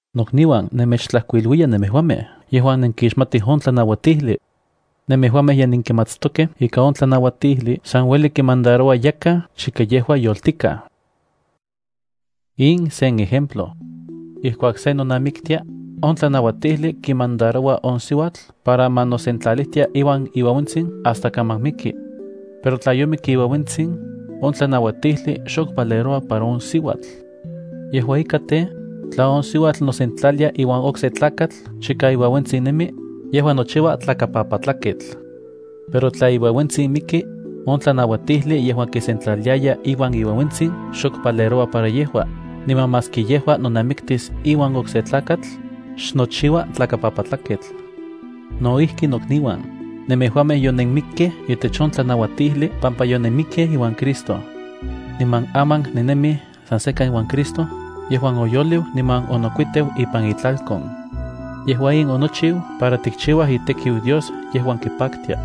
Nokniuan, nemechtlajkuiluiya nemejuamej yejuan nenkixmatij on tlanauatijli. Nemejuamej ye nenkimatstokej ika on tlanauatijli san ueli kimandaroua yakaj chika yejua yoltikaj. In sen ejemplo. Ijkuak se nonamiktia, on tlanauatijli kimandaroua on siuatl para ma nosentlalijtia iuan iueuentsin hasta kaman miki. Pero tla yomik iueuentsin, on tlanauatijli xok valeroua para on siuatl. Yejua ika tej, tla on siuatl nosentlalia iuan okse tlakatl chika iueuentsin nemi, yejua nochiua tlakapapatlaketl. Pero tla iueuentsin miki, on tlanauatijli yejuan kisentlaliaya iuan iueuentsin xok valeroua para yejua, niman maski yejua nonamiktis iuan okse tlakatl, xnochiua tlakapapatlaketl. No ijki nokniuan, nemejuamej yonenmikkej itech on tlanauatijli pampa yonenmikkej iuan Cristo. Niman aman nennemij san sekan iuan Cristo yejuan oyoliu niman onokuiteu ipan itlalkon. Yejua in onochiu para tichiuaj itekiu Dios yejuan kipaktia.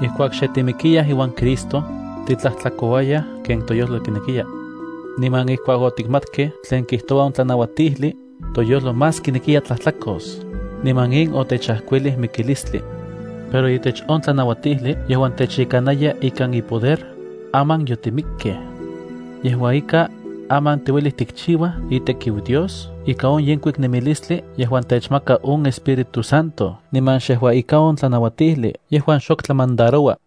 Ijkuak xe timikiyaj iuan Cristo, titlajtlakouayaj ken toyojlo kinekiya. Niman ijkuak otikmatkej tlen kijtoua on tlanauatijli, toyojlo más kinekiya tlajtlakos, niman in otechajkuilij mikilistli. Pero itech on tlanauatijli yejuan techyekanaya ikan ipoder, aman yotimikkej. Yejua ika, aman tiuelij tikchiuaj itekiu Dios ika on yenkuik nemilistli yejuan techmaka on Espíritu Santo niman xejua ika on tlanauatijli yejuan xok tlamandaroua.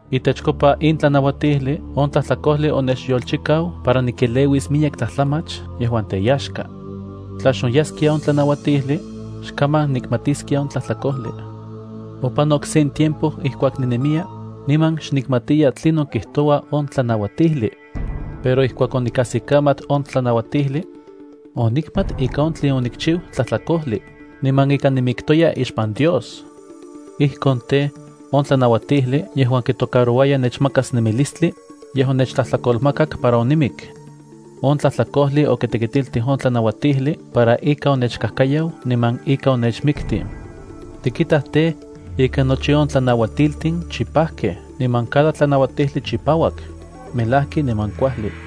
Itechkopa in tlanauatijli on tlajtlakojli onechyolchikau para nikeleuis miyek tlajtlamach yejuan teyaxka. Tla xonyaskia on tlanauatijli, xkaman nikmatiskia on tlajtlakojli. Opanok sen tiempo ijkuak ninemiya, niman xnikmatiya tlinon kijtoua on tlanauatijli. Pero ijkuak onikajsikamat on tlanauatijli, onikmat ika on tlen onikchiu tlajtlakojli, niman ika nimiktoya ixpan Dios. Ijkon tej, on tlanauatijli yejuan kitocarouaya nechmakas nemilistli, yej onechtlajtlakolmakak para onimik. On tlajtlakojli okitekitiltij on tlanauatijli para ika onechkajkayau niman ika onechmiktij. Tikitaj tej, ika nochi on tlanauatiltin chipajkej niman cada tlanauatijli chipauak, melajki niman kuajli.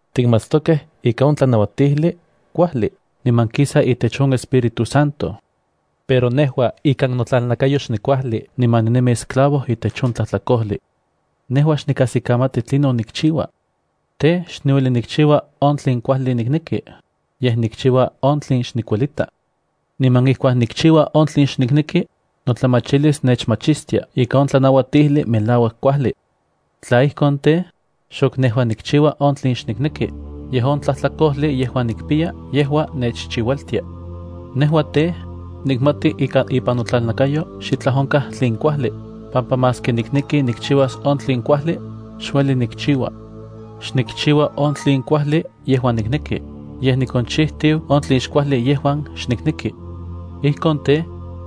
Tikmatstokej ika on tlanauatijli kuajli niman kisa itech on Espíritu Santo. Pero nejua ikan notlalnakayo xnikuajli niman ninemi esclavo itech on tlajtlakojli. Nejua xnikajsikamati tlinon nikchiua. Tej, xniueli nikchiua on tlen kuajli nikneki, yej nikchiua on tlen xnikuelita. Niman ijkuak nikchiua on tlen xnikneki, notlamachilis nechmachistia ika on tlanauatijli melauak kuajli. Tla ijkon tej, xok nejua nikchiua on tlen xnikneki, yej on tlajtlakojli yejuan nikpiya yejua nechchiualtia. Nejua tej, nikmati ika ipan notlalnakayo xitlaj onkaj tlen kuajli, pampa maski nikneki nikchiuas on tlen kuajli, xueli nikchiua. Xnikchiua on tlen kuajli yejuan nikneki, yej nikonchitiu on tlen xkuajli yejuan xnikneki. Ijkon tej,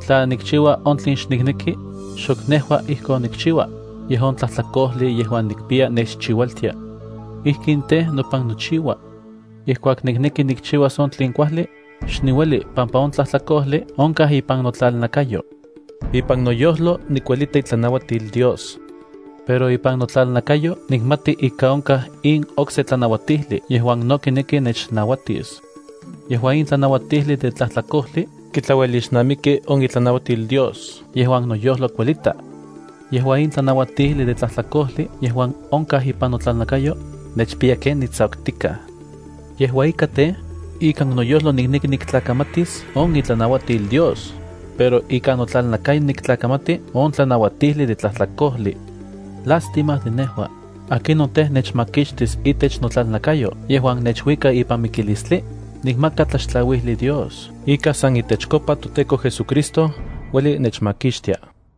tla nikchiua on tlen xnikneki, xok nejua ijkon nikchiua, yej on tlajtlakojli yejuan nikpiya nechchiualtia. Ijkin tej, nopan nochiua. Ijkuak nikneki nikchiuas on tlen kuajli, xniueli pampa on tlajtlakojli onkaj ipan notlalnakayo. Ipan noyojlo nikuelita itlanauatil Dios. Pero ipan notlalnakayo nikmati ika onkaj in okse tlanauatijli yejuan no kineki nechnauatis. Yejua in tlanauatijli de tlajtlakojli kitlauelixnamiki on itlanauatil Dios yejuan noyojlo kuelita. Yejua in tlanauatijli de tlajtlakojli yejuan onkaj ipan notlalnakayo, nechpiya ken nitsakutikaj. Yejua ika tej, ikan noyojlo nikneki niktlakamatis on itlanauatil Dios, pero ikan notlalnakayo niktlakamati on tlanauatijli de tlajtlakojli. ¡Lástima de nejua! ¿Akinon tej, nechmakixtis itech notlalnakayo yejuan nechuika ipan mikilistli? Nikmaka tlaxtlauijli Dios ika san itechkopa toTEKO JesuCristo ueli nechmakixtia.